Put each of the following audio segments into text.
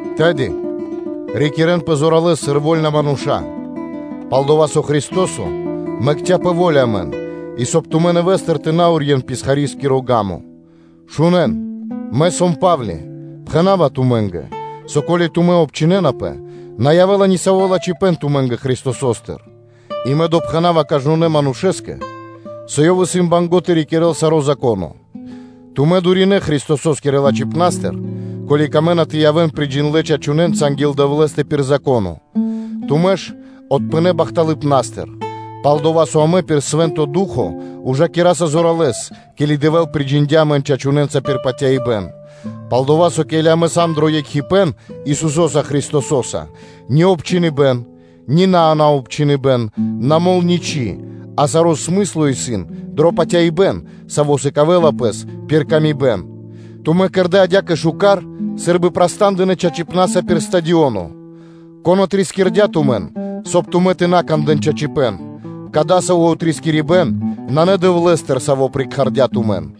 Тэды, рикирэнпэ зоралэ́с сыр вольна мануша́, пал-дова́ со Христо́со мэкця́ пэ во́ля амэн и, соб (кай) тумэ́ нэвэ́стыр тэ на урьен писхарискиро ґа́мо. Шунэ́н! Мэ, сом Па́вли, пхэна́ва тумэ́нгэ, со, ко́ли тумэ́ обчхинэнапэ, на явэ́ла ни саво́ лачхипэ́н тумэ́нгэ Христосостыр. И мэ допхэнава кажнонэ́ манушэ́скэ, со ёв (исын) банго́ (мусинэла) тэ рикирэ́л саро́ Зако́но. Тумэ́ дуринэ Христосо́скирэ лачхипнастыр, ко́ли камэ́на тэ явэ́н приджиндлэ чачунэнца анги́л Дэвлэ́стэ пир Зако́но; тумэ́ ж отпынэ бахталыпнастыр. Пал-дова́ со амэ пир Свэ́нто Ду́хо (Фа́но) ужакираса зоралэ́с, ке́ли Дэвэ́л приджиндя амэн чачунэнца пир патяибэ́н. Пал-дова́ со, ке́ли амэ сам дро екхипэ́н Исусо́са Христосо́са, ни обчхиныбэн, ни наобчхыныбэн на мол ничы́, а саро́ смысло исын дро патяибэ́н, саво́ сыкавэ́ла пэс пир паты́в кэ яви́р мануша́. Тумэ́ кэрдэ́ адя́кэ шука́р сы́рбы праста́ндынэ чачипна́са пир стадионо! Кон отрискирдя тумэн, соб (кай) тумэ́ тэ на кандэ́н чачипэ́н. Кадасаво́ отрискирибэн нанэ Дэвлэ́стыр, Саво́ прикхардя тумэн.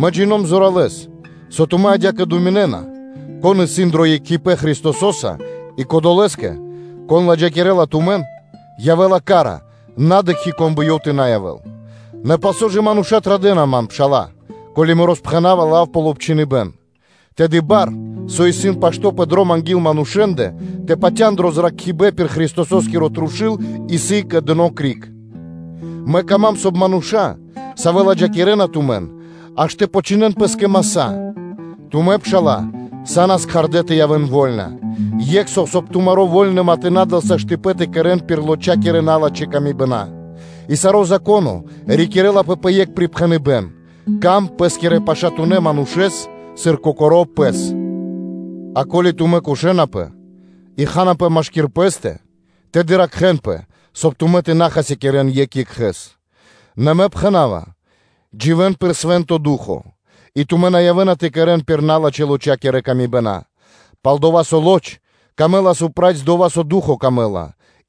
Мэ джино́м зоралэ́с, со тумэ́ адя́кэ думинэ́на, кон исын дро екхипэ́н Христосо́са, и кодолэ́скэ, кон ладжакирэла тумэн, явэ́ла ка́ра, на дыкхи́, кон бы ёв тэ на явэ́л. Нэ палсо́ ж мануша́ традэ́на ман, пшала́лэ, ко́ли мэ роспхэнава лав пал обчхиныбэн? Тэды бар, со исын пашто́ пэ дром анги́л манушэ́ндэ, тэ патя́н дро зракхибэ́н пир Христосо́скиро трушу́л, исын кэдыно криг. Мэ кама́м, соб (кай) мануша́, савэ́ ладжакирэна тумэн, аж тэ почхинэн пэ́скэ маса́. Тумэ́, пшала́лэ, са́нас кхардэ́ тэ явэ́н вольна. Екх со, соб (кай) тумари́ вольныма тэ на дэл саштыпэн тэ кэрэ́н пир лочакирэ-налачхэ́ камибэна. И саро́ Зако́но рикирлапэ пэ екх припхэныбэ́н: “Сыка́в паты́в пэ́скирэ пашатунэ́ манушэ́скэ, сыр кокоро́ пэ́скэ.” А ко́ли тумэ́ кошэнапэ и ханапэ машки́р пэ́стэ, тэды ракхэ́нпэ, соб (кай) тумэ́ тэ на хасякирэ́н екх екхэ́с. Нэ мэ пхэна́ва, дживэ́н пир Свэ́нто Ду́хо (Фа́но), и тумэ́ на явэ́на тэ кэрэ́н пир налачхэ́-лочакиро камибэн. Пал-дова́ со лочакэ на трэй дова́, со Духоскэ трэй,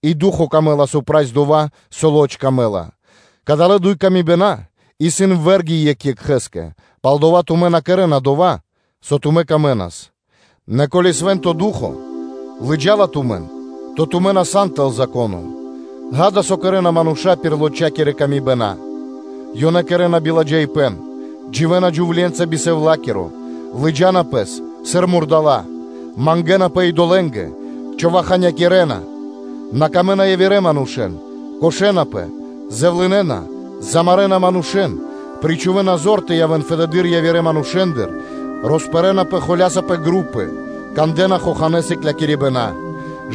и Духоскэ (Фаноскэ) трэй на дова́, со лочакэ трэй: кадалэ́ дуй камибэна исын вэ́рги екх екхэ́скэ; палдава́ тумэ́ на кэрэ́на дова́, со тумэн тырдэла, нэ ко́ли Свэ́нто Ду́хо (Фа́но) лыджа́ла тумэн, то тумэ́ на сан тэл Зако́но. Ѓа́да, со кэрэ́на мануша́ пир лочакирэ камибэна: ёнэ кэрэ́на биладжаипэ́н, дживэ́на джувле́нца би сэвлакиро, лыджа́на пэс сыр мурдала́ (жывотна); мангэ́напэ идолэ́нгэ, човаханякирэна, на сыкавэ́на паты́в явирэ манушэ́нгэ, кошэнапэ, зэвлынэна, замарэна манушэ́н, причхувэна зор тэ явэ́н фэдэды́р явирэ манушэ́ндыр, роспэрнапэ холя́са пэ групы, кандэ́на хоханэ́ сыклякирибэна,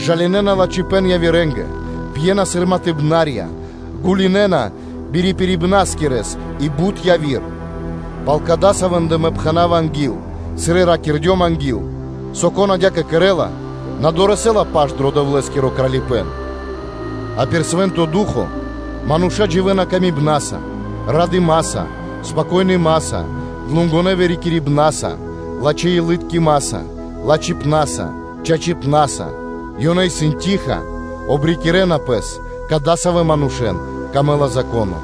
жалинэна лачхипэ́н явирэ́нгэ, пьена сыр матыбнарья, гулинэна бирипирибнаскирэс и бут яви́р; пал кадасавэндэ мэ пхэна́ва анги́л, сыр и ракирдём англэды́р, со, кон адя́кэ кэрэ́ла, на дорэсэ́ла паш дро Дэвлэ́скиро Кралипэ́н. А пир Свэ́нто Ду́хо (Фа́но) мануша́ дживэ́на патыва́са кэ яви́р мануша́, радыма́са, спокойнымаса, длугонэ вырикирибнаса, лачхэ́-илыткимаса, лачхипна́са, чачипна́са; ёнэ исын штыл (тиха), обрикирэна пэс, – кадасавэ́ манушэ́н притырдэла кэ пэ Зако́но.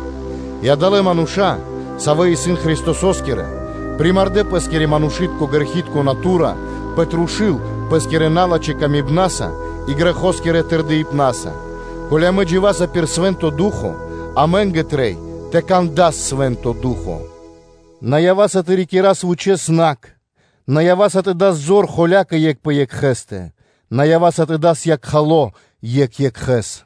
И адалэ́ мануша́, савэ́ исын Христосо́скирэ, примардэ пэ́скири манушы́тко грэхи́тко натура пэ трушу́л пэ́скирэ налачхэ́ камибнаса и грэхоскирэ тырдыпнаса. Ко́ли амэ дживаса пир Свэ́нто Ду́хо (Фа́но), амэ́нгэ трэй и тэ кэра́с пир Свэ́нто Ду́хо (Фа́но). На ява́са тэ рикирас вучэ́с накх, на ява́са тэ дас зор холякэ екх пэ екхэ́стэ, соб (кай) тэ на дас якхало екх екхэ́с.